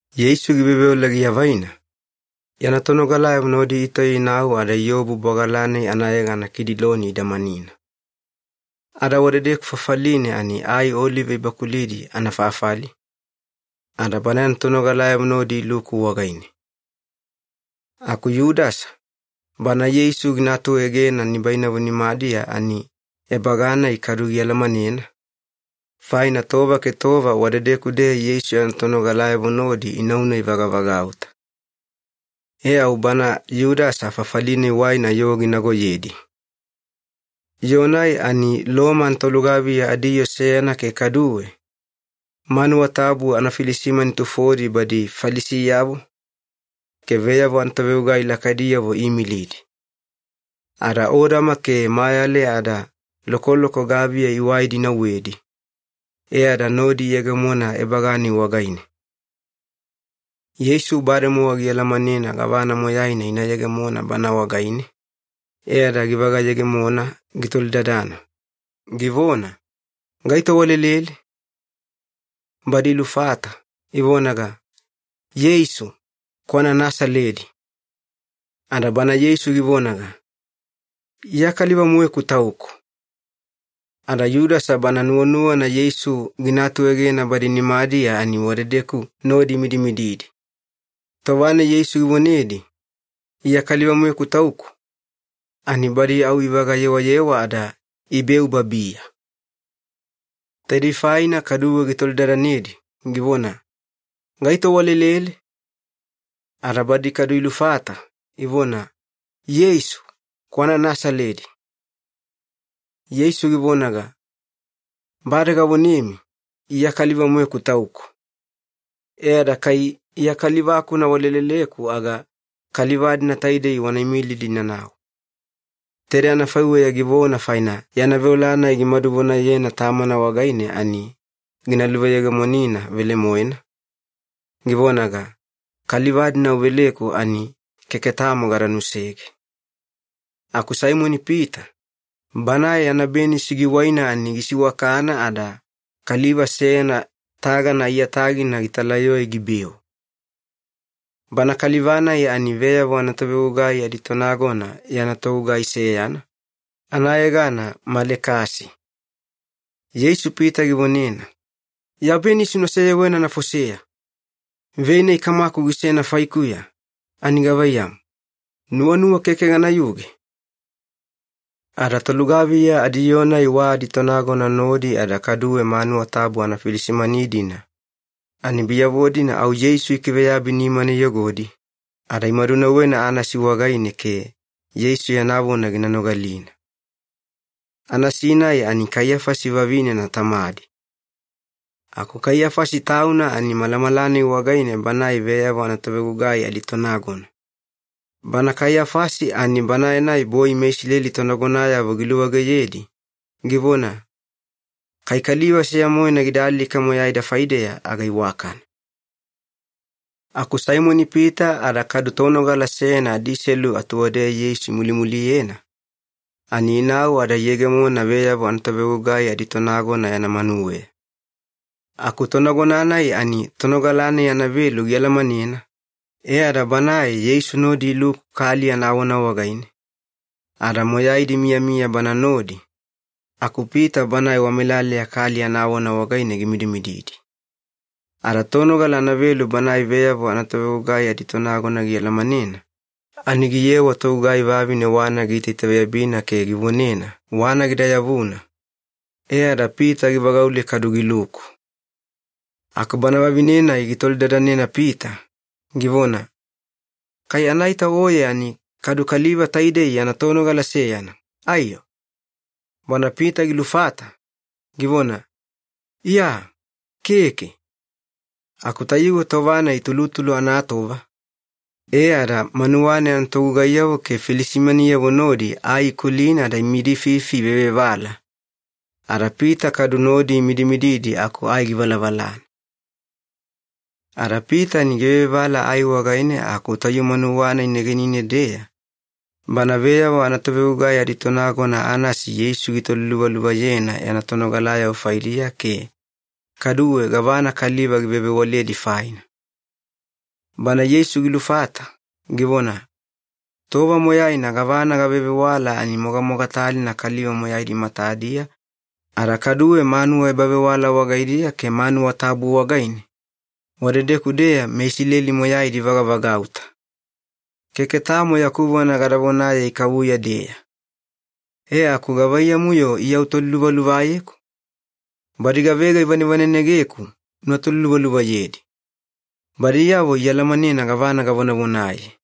Yeisu giveoveola giavaina, yana tonogalayavo nodi itauya inau ada iobu bwagala-nai anayegana Kidiloni idamanina. Ada wadedeku fafaline ani ai olive ibakulidi anafafali, ada Bana yana tonogalayavo nodi iluku wagaine. Aku Yudasa, bana Yeisu gina atuegena nibainavo nimadiya ani ebaga-nai kadu gialamanena, faina tova ke tova wadedeku-deya Yeisu yana tonogalayavo nodi inauna ivagavagauta. E au bana Yudasa fafali-nai waina yoo ginagoyedi. Yoo-nai ani Loma anatolugaviya adiyoo seyana ke kaduwe, manuwa tabu anafilisimani tufodi badi Falisiyavo, ke veyavo anatovegugai lakaidiyavo iimilidi. Ada odama ke mayale ada lokoloko gaviya iwaidi inauwedi, e ada nodi iyegemona ebaga-nai wagaine. Yeisu bademowa gialamanena gavana moyaina ina yegemona Bana wagaine, e ada givaga-yegemona gitolidadana, givona, “Gaito walelele?” Badi ilufata, ivonaga, “Yeisu, kwana Nasaledi.” Ada Bana Yeisu givonaga, “Iya kaliva-moeku Tauku.” Ada Yudasa bana nuwanuwana Yeisu gina atuegena badi nimadiya ani wadedeku nodi imidimididi. Tova-nai Yeisu givonedi, “Iya kaliva-moeku Tauku,” ani badi au ivaga-yewayewa ada ibeu babiya. Taidei faina kaduwe gitolidadanedi, givona, “Gaito walelele?” Ada badi kadu ilufata, ivona, “Yeisu, kwana Nasaledi.” Yeisu givonaga, “Bade gavonemi, ‘Iya kaliva-moeku Tauku’. E ada kai Iya kaliva-kuna waleleleku aga kaliva-dina taidei wana imilidi inanau.” Taidei anafaiweya givona faina yana veola-nai gimadu vonayena Tamana wagaine ani gina luveyegemonina velemoena, givonaga, “Kaliva-dina uveleku ani keke tamo gada nusege.” Aku Saimoni-Pita, banae yana benisi giwaina ani gisiwakana ada kaliva seyana tagana aiyatagina gitalayoe gibeu. Bana kaliva-nai ani veyavo anatovegugai aditonagona yana togugai seyana, anayegana Malekasi. Yeisu Pita givonena, “Ya benisi una seyewena anafoseya! Vei-nai Kamaku gisena faikuya ani gavaiyamu, nuwanuwa keke ganayuge?” Ada tolugaviya adiyoo-nai wa aditonagona nodi ada kaduwe manuwa tabu anafilisimani-dina, ani biyavo-dina au Yeisu ikiveyabi nimana iyogodi, ada imadunauwena Anasi wagaine ke Yeisu yana vona gina nogalina. Anasi-nai ani Kaiyafasi vavinena tamadi. Aku Kaiyafasi tauna ani malamala-nai wagaine banae veyavo anatovegugai aditonagona. Bana Kaiyafasi ani banae-nai boi meIsileli tonagonayavo giluwageyedi, givona, “Kai kaliva seya-moena gida alika moyaida faideya aga iwakana.” Aku Saimoni-Pita ada kadu tonogala seyana adiselu atuwadeya Yeisu imulimuliyena, ani inau ada iyegemona veyavo anatovegugai aditonagona yana manuweya. Aku tonagona-nai ani tonogala-nai anavelu gialamanena, e ada banae Yeisu nodi iluku kali anawana wagaine, ada moyaidi imiyamiya Bana nodi, aku Pita banae wamelaleya kali anawana wagaine gimidimididi. Ada tonogala anavelu banae veyavo anatovegugai aditonagona gialamanena, ani giyewa togugai vavine wana giitaitaveyabina ke givonena wana gida yavuna, e ada Pita givagaule kadu giluku. Aku bana vavine-nai gitolidadanena Pita, givona, “Kai anaita oye ani kadu kaliva taidei yana tonogala seyana, aiyo?” Bana Pita gilufata, givona, “Iya, keke.” Aku tayuwe tova-nai tulutulu anatova, e ada manuwa-nai anatogugaiyavo ke filisimaniyavo nodi ai ikulina ada imidififi ivevevala, ada Pita kadu nodi imidimididi aku ai givalavalana. Ada Pita ani givevevala ai wagaine aku tayu manuwa-nai negenine-deya, bana veyavo anatovegugai aditonagona Anasi Yeisu gitoliluvaluvayena yana tonogalayavo faidiya ke kaduwe gavana kaliva givevewaledi faina. Bana Yeisu gilufata, givona, “Tova moyaina gavana gavevewala ani mogamogatalina kaliva moyaidi matadiya ada kaduwe manuwa ebavewala wagaidiya ke manuwa tabu wagaine, wadedeku-deya meIsileli moyaidi ivagavagauta. Keke tamo yaku vona gada vonaye ikavuya-deya. E aku gavaiyamu-yo Iya utoliluvaluvayeku? Badi gavega ivanevanenegeku una toliluvaluvayedi. Badiyavo ialamanena gavana gavonavonaye.”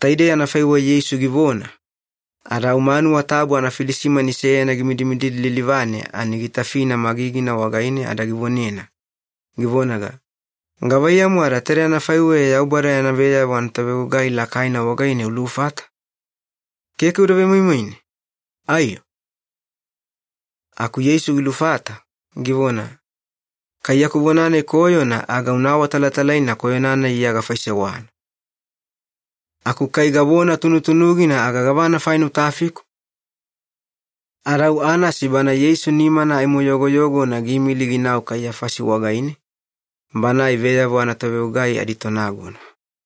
Taidei anafaiweya Yeisu givona, ada au manuwa tabu anafilisimani seyana gimidimididi lilivane ani gitafina magigina wagaine ada givonena, givonaga, “Gavaiyamu ada taide anafaiweya Yaubada yana veyavo anatovegugai lakaina wagaine ulufata? Keke uda vemoimoine, aiyo?” Aku Yeisu gilufata, givona, “Kai yaku vona-nai koyona aga una awatalatalaina koyona-nai Iya gafaisewana. Aku kai gavona tunutunugina aga gavana faina utafiku?” Ada au Anasi Bana Yeisu nimana aimo yogoyogona giimili ginau Kaiyafasi wagaine, banae veyavo anatovegugai aditonagona.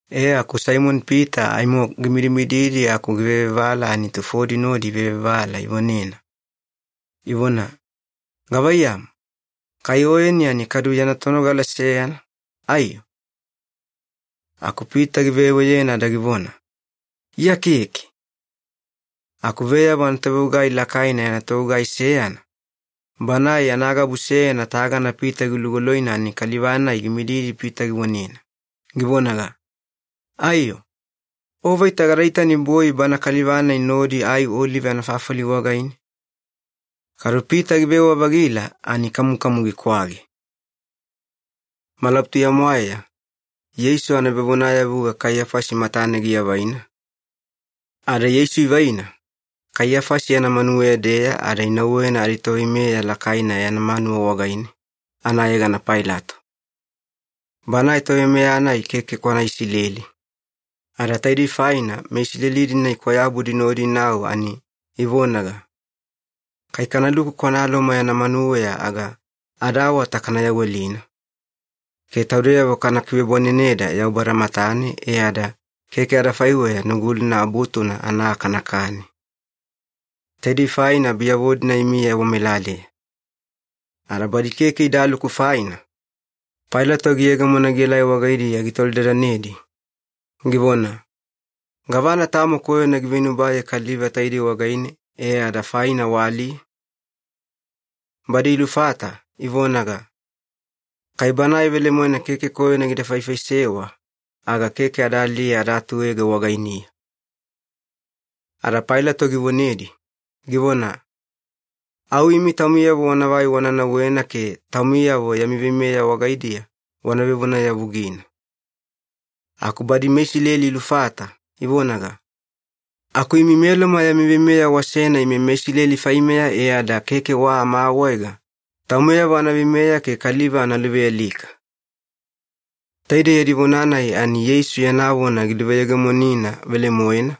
E aku Saimoni-Pita aimo gimidimididi aku givevevala ani tufodi nodi ivevevala ivonena, ivona, “Gavaiyamu, kai oyeni ani kadu yana tonogala seyana, aiyo?” Aku Pita giveweyena ada givona, “Iya keke.” Aku veyavo anatovegugai lakaina yana togugai seyana, banae yana gabu seyana tagana Pita gilugoloina ani kaliva-nai gimididi Pita givonena, givonaga, “Aiyo, o vaita gada itani boi bana kaliva-nai nodi ai olive anafafali wagaine?” Kadu Pita givewa-vagila ani kamukamu gikwage. Malabutuya-mwaeya Yeisu anavevonayavuga Kaiyafasi matane giavaina, ada Yeisu ivaina Kaiyafasi yana manuweya-deya ada inauwena aditoveimeya lakaina yana manuwa wagaine, anayegana Pailato. Banae toveimeya-nai keke kwana Isileli, ada taidei faina meIsileli-dina ikwayabudi nodi inau ani ivonaga, “Kai kanaluku kwana Loma yana manuweya aga adaawata kana yawelina, ke taudeyavo kana kivebwaneneda Yaubada matane e ada keke adafaiweya Nugulina Abutuna ana aa kanakani.” Taidei faina biyavo-dina imiya wamelaleya. Ada badi keke idaluku faina, Pailato giyegemona gielai wagaidiya gitolidadanedi, givona, “Gavana tamo koyona giveinubaye kaliva taidei wagaine, e ada faina waaliye?” Badi ilufata, ivonaga, “Kai Banae velemoena keke koyona gida faifaisewa aga keke ada aliye ada atuege wagainiya.” Ada Pailato givonedi, givona, “Au imi taumiyavo wanavai wana nauwena ke taumiyavo yami veimeya wagaidiya wana vevonayavugina.” Aku badi meIsileli ilufata, ivonaga, “Aku imi meLoma yami veimeya wasena ime meIsileli faimeya e ada keke wa amaawaega taumeyavo ana veimeya ke kaliva ana luvealika.” Taidei yadi vona-nai ani Yeisu yana vona giluveyegemonina velemoena,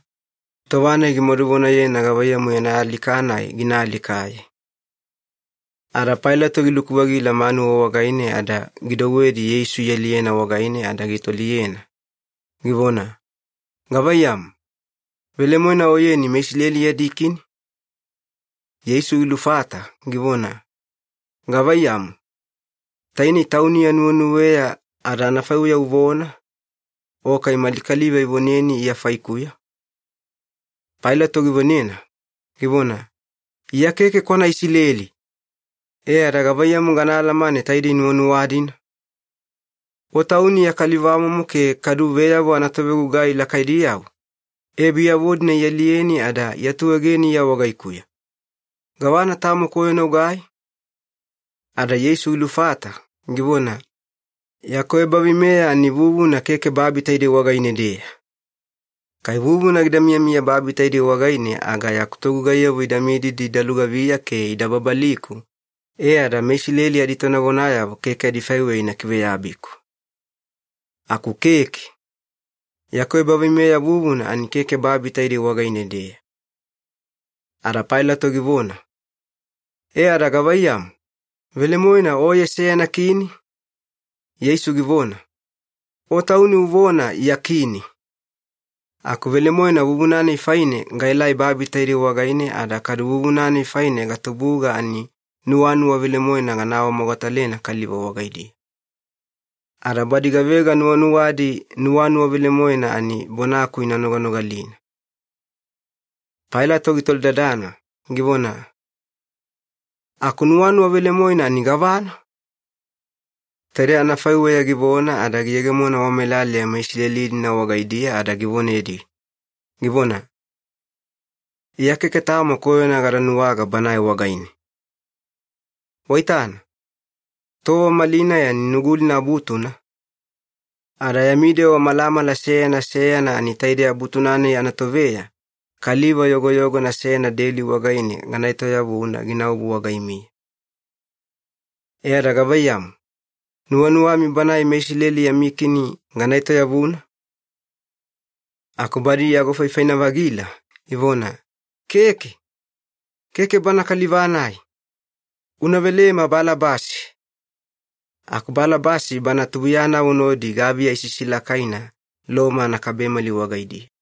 tova-nai gimadu vonayena gavaiyamu yana alika-nai gina alikaye. Ada Pailato giluku-vagila manuwa wagaine ada gidouwedi Yeisu ialiyena wagaine ada gitoliyena, givona, “Gavaiyamu, velemoena Oyeni meIsileli yadi Kini?” Yeisu gilufata, givona, “Gavaiyamu, tainei tauni ya nuwenuweya ada anafaiweya uvona, o kai mali kaliva ivoneni Iya faikuya?” Pailato givonena, givona, “Iya keke kwana Isileli! E ada gavaiyamu gana alamane taide nuwanuwa-dina? O Tauni ya kalivamomo ke kadu veyavo anatovegugai lakaidiyavo, e biyavo-dina ialiyeni ada iatuegeni Iya wagaikuya. Gavana tamo koyona ugai?” Ada Yeisu gilufata, givona, “Yaku ebaveimeya ani vuvuna keke babi taide wagaine-deya. Kai vuvuna gida miyamiya babi taidei wagaine aga yaku togugaiyavo ida mididi ida lugaviya ke ida babaliku, e ada meIsileli aditonagonayavo keke adifaiweya ina kiveyabiku. Aku keke. Yaku ebaveimeya vuvuna ani keke babi taidei wagaine-deya.” Ada Pailato givona, “E ada gavaiyamu, velemoena Oye seyana kini?” Yeisu givona, “O tauni uvona Iya kini. Aku velemoena vuvuna-nai faine gaelai babi taidei wagaine ada kadu vuvuna-nai faine gatubuga ani nuwanuwa velemoena gana awamogatalena kaliva wagaidiya. Ada badi gavega nuwanuwadi nuwanuwa velemoena ani bonaku ina noganogalina.” Pailato gitolidadana, givona, “Aku nuwanuwa velemoena ani gavana?” Taidei anafaiweya givona ada giyegemona wamelaleya meIsileli-dina wagaidiya ada givonedi, givona, “Iya keke tamo koyona gada nuwaga Banae wagaine. Waitana, tova malinai ani Nugulina Abutuna, ada yami dewa malamala seyana seyana ani taidei Abutu-nai anatoveya kaliva yogoyogona seyana deli wagaine gana etoyavuna ginaobu wagaimiya. E ada gavaiyamu, nuwanuwami Banae meIsileli yami kini gana etoyavuna?” Aku badi iagofaifaina-vagila, ivona, “Keke! Keke Banae kaliva-nai! Una velema Balabasi!” Aku Balabasi bana tubuiyanavo nodi gaviya isisilakaina Loma anakabemali wagaidiya.